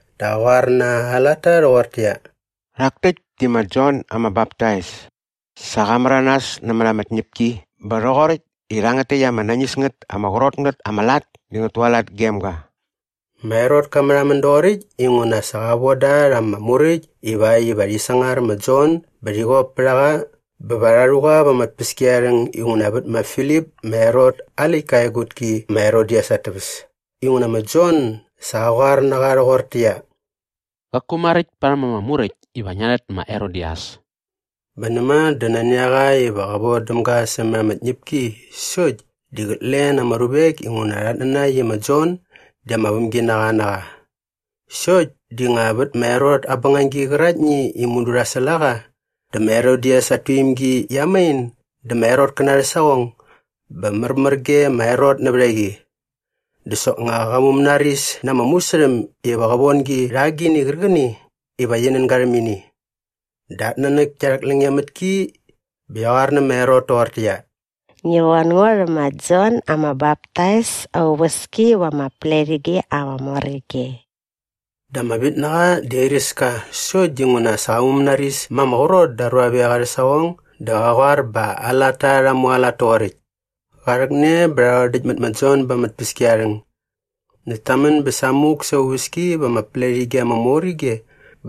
dä qa qoar na aa latta rhoqortäqyia, “Rhak täkt di ma Jon ama Baptais. Sa qa märanas nämät ama tñäpki bä rhoqoräkt i rhangät täkt ama nañis ngät ama qrot ngät ama lat di ngät tualat gem ga.” Ma Herot ka märhamän doqoräkt inguna sa qa voda rha ama muräkt ivakt iva rhi sangar ma Jon bä rhi qop pät a qa bä va rha rhu qa va ama tpäskiarharhäng inguna vät ma Filip ma Herot aa läktka aa egutki ma Herodias at täväs inguna ma Jon sa qa qoar na qa rhoqortäqyia, “Qaku maräkt parhäm ama Muräkt iva ngia rhät ma Herodias.” Bä näma dä nani a qa iva qä vodäm ga sämät ama tñäpki sokt di qät len ama ruvek inguna rhat nanakt i ma Jon di ama vämginaqa na qa. Sokt di nga vät ma Herot aa bängagi qäraktni i mudu rha säl a qa dä ma Herodias at tuimgi qia main dä ma Herotkäna arhä saqong bä märmär ge ma Herot nävät a qi. Dä soknga qa mumänaris na ama musärhäm iva qä von gi rha agini qärqäni iva qi nän ga rhäm ini. Dä at nanäk kia rhäklänge mät ki bä qia qoar nä ma Herot toqortäqyia, “Ngi von ngo rhä ma Jon ama Baptais aa uväski va ama pletige ama mor ige.” Dä ama vitnaqa di airäs ka sokt dinguna sa qa mumänaris ma ama qrot da aa ruavek arhä saqong dä qa qoar bä aa latta rha mualat toqoräkt. Qa rhäkne bä rha rhodäkt mät ma Jon ba ama tpäskiarharhäng näkt ta män bä samuk sa aa uväski va ama pletige ama mor ige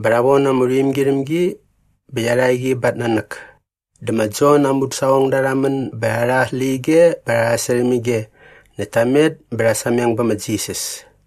bä rha von ama rhuimgi rhäm gi bä qia rha qi ba at nanäk. Dä ma Jon aa mudäsaqongda rha män bä rha rha aa släqyige bä rha sasärhäm ige näkt ta met bä rha sameng bä ma Jisas.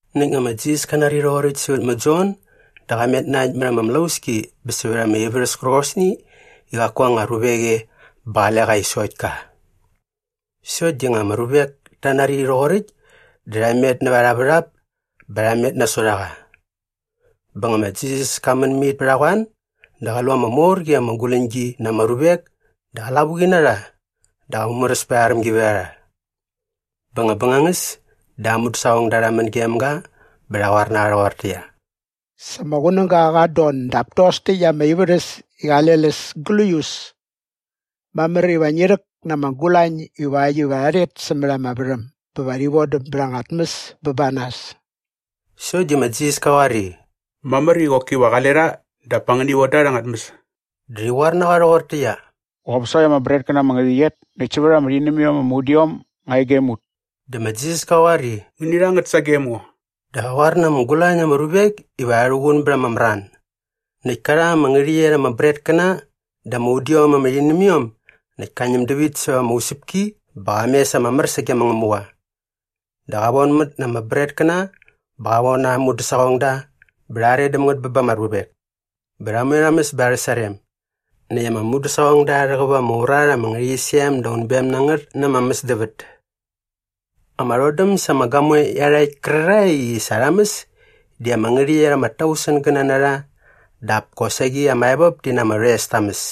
Näkt nga ma Jisas ka nari rhoqoräkt sävät ma Jon dä qa met na äkt mät ama mlauski bä sävät ama ivärhäs kärqosni i qaku anga ruvek e bä qale qa e i sokt ka. Sokt di nga ama ruvek ta nari rhoqoräkt dä rha met näva arha värhap bä rha met nasot a qa. Bä nga ma Jisas ka män mit pät a qoan dä qa lu ama mor qi ama guläñgi na ama ruvek dä qa lavuqi na rha dä qa mumäräs pät arha rämgivärharha. Bä nga bängangäs dä aa mudäsaqongda rha män gem ga bä rha qoar na qa rhoqortäqyia, “Sa ama qunäga qat don dap tos täkt ama ivärhäs di qale läs gläius. Mamär iva ngi rhäk na ama gulañ ivakt iva rha rhet sämät ama värhäm bä va rhi vodäm bät anga tmäs bä ba nas.” Sokt di ma Jisas ka qoar i, “Mamär iva qoki qale rha dap pa ngäni von da rha anga tmäs.” Dä rhi qoar na qa rhoqortäqyia, “Qop sokt ama bretkäna ama ngärhäqyet näkt sävät ama rhinämiom ama udiom nga e gem ut.” Dä ma Jisas ka qoar i, “Ngäni rha ngät sagem ngo.” Dä qa qoar na ama gulañ na ama ruvek iva rha rhuqun bät ama mran. Näkt ka rha ama ngärhäqyet ama bretkäna dä ama udiom ama rhinämiom näkt ka ñäm dävit säva ama usäpki bä qa mes ama mär sage ma Ngämuqa. Dä qa vonmät na ama bretkäna bä qa von aa mudäsaqongda bä rha are däm ngät bä ba ama ruvek. Bä rha moe rha mäs bä arhä sarem. Näkt ama mudäsaqongda rha rhäqäp ama urat ama ngärhäqyisem da unbem na ngät na ama mäsdävät. Ama rhodäm sa ama gamoe iarhakt kärarhae i sa rha mäs di ama ngärhäqyet ama tausengäna na rha dap kosaqi ama evop ti na ama rhoes ta mäs.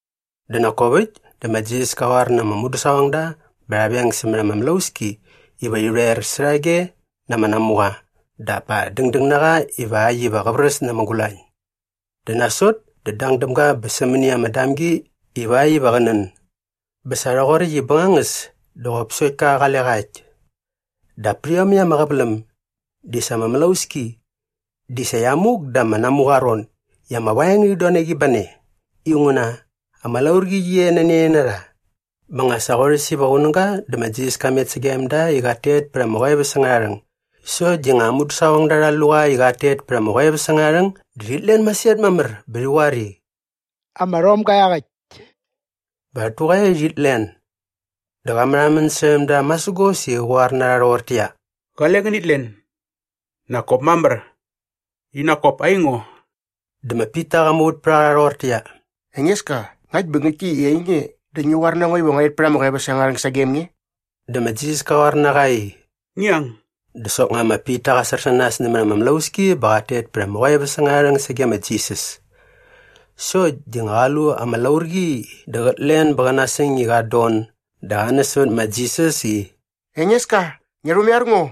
Dä nak kop äkt dä ma Jisas ka qoar na ama mudäsaqongda bä rha veng sämät ama mlauski iva rhi rhoer särhage na ama namuqa dap pa dängdäng na qa ivakt iva qä vräs na ama gulañ. Dä nasot dä dang däm ga bä sämäni ama damgi ivakt iva qä nän. Bä sa rhoqoräkt i bängangäs dä qop sokt ka qale qa äkt. Dap pät iomäkt ama qäväläm di sa ama mlauski di sa qia muk da ama namuqa aa ron i ama vaeng ngärhit don na qi ba ne inguna ama laurqi qi e nani a ne na rha. Bä nga sa qorhäs iva qunäga dä ma Jisas ka met sagem da i qat tet pät ama qoeväs angärha rhäng. Sokt di nga aa mudäsaqongda rha lu qa i qat tet pät ama qoeväs angärha rhäng dä rhit len masirhat mamär bä rhi qoar i, “Ama rhomga iaqäkt!” Bä rhat tuqaia i rhit len. Dä qa märhamän särhäm da masägos i qä qoar na rha rhoqortäqyia, “Qale ngänit len! Nak kop mamär. I nak kop aingo.” Dä ma Pita qa muvät pät a qa rhoqortäqyia, “Engeska, ngakt bä ngäktki i ainge dä ngi qoar na ngo iva ngua rhet pät ama qoeväs angärha rhäng sagem nge.” Dä ma Jisas ka qoar na qa i, “Ngi ang!” Dä soknga ma Pita qa sär sä nas nämät ama mlauski bä qat tet pät ama qoeväs angärha rhäng sage ma Jisas. Sokt di nga qa lu ama laurqi dä qät len bä qä nasäng i qat don dä qa näs sävät ma Jisas i, “Engeska, ngia rhumaiar ngo.”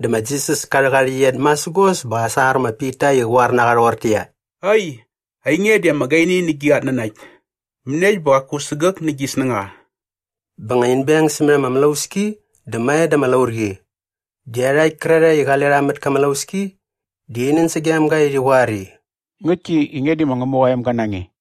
Dä ma Jisas ka rhäk aa rhäqyet masägos bä qa sangar ma Pita i qä qoar na qa rhoqortäqyia, “Ai, ainge di ama gaini nä gi qatnanakt. Mäniekt bä qaku sägäk nä gi snängaqa?” Bä nga in beng sämät ama mlauski dä mae da ama laurqi. Dä iarhakt kärarhae i qale rha mät kä mlauski di rhi nän sagem ga i rhi qoar i, “Ngäktki i nge di ma Ngämuqa aa emga na nge.”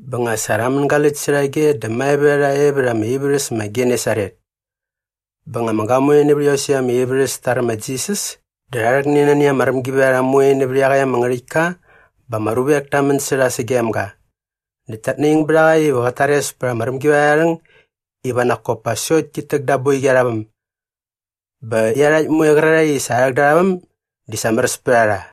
Bä nga sa rha mängaläkt särhage dä mae vät a rha e vät ama ivärhäs ma Genesaret. Bä nga ama gamoe nävät iosäkt ama ivärhäs ta räm ma Jisas dä rha rhäkne nani ama rämgivärharha moe nävät iaqäkt ama ngärhäktka bä ama ruvek ta män sä rha sagem ga. Näkt tat naing bät a qa iva qät tares pät ama rämgivärharha arha rhäng iva nak kop pa sokt tit täk da aa boiqi arha väm. Bä iarhakt moe qärarhae i sa rha rhäk da arha väm di sa märäs pät a rha.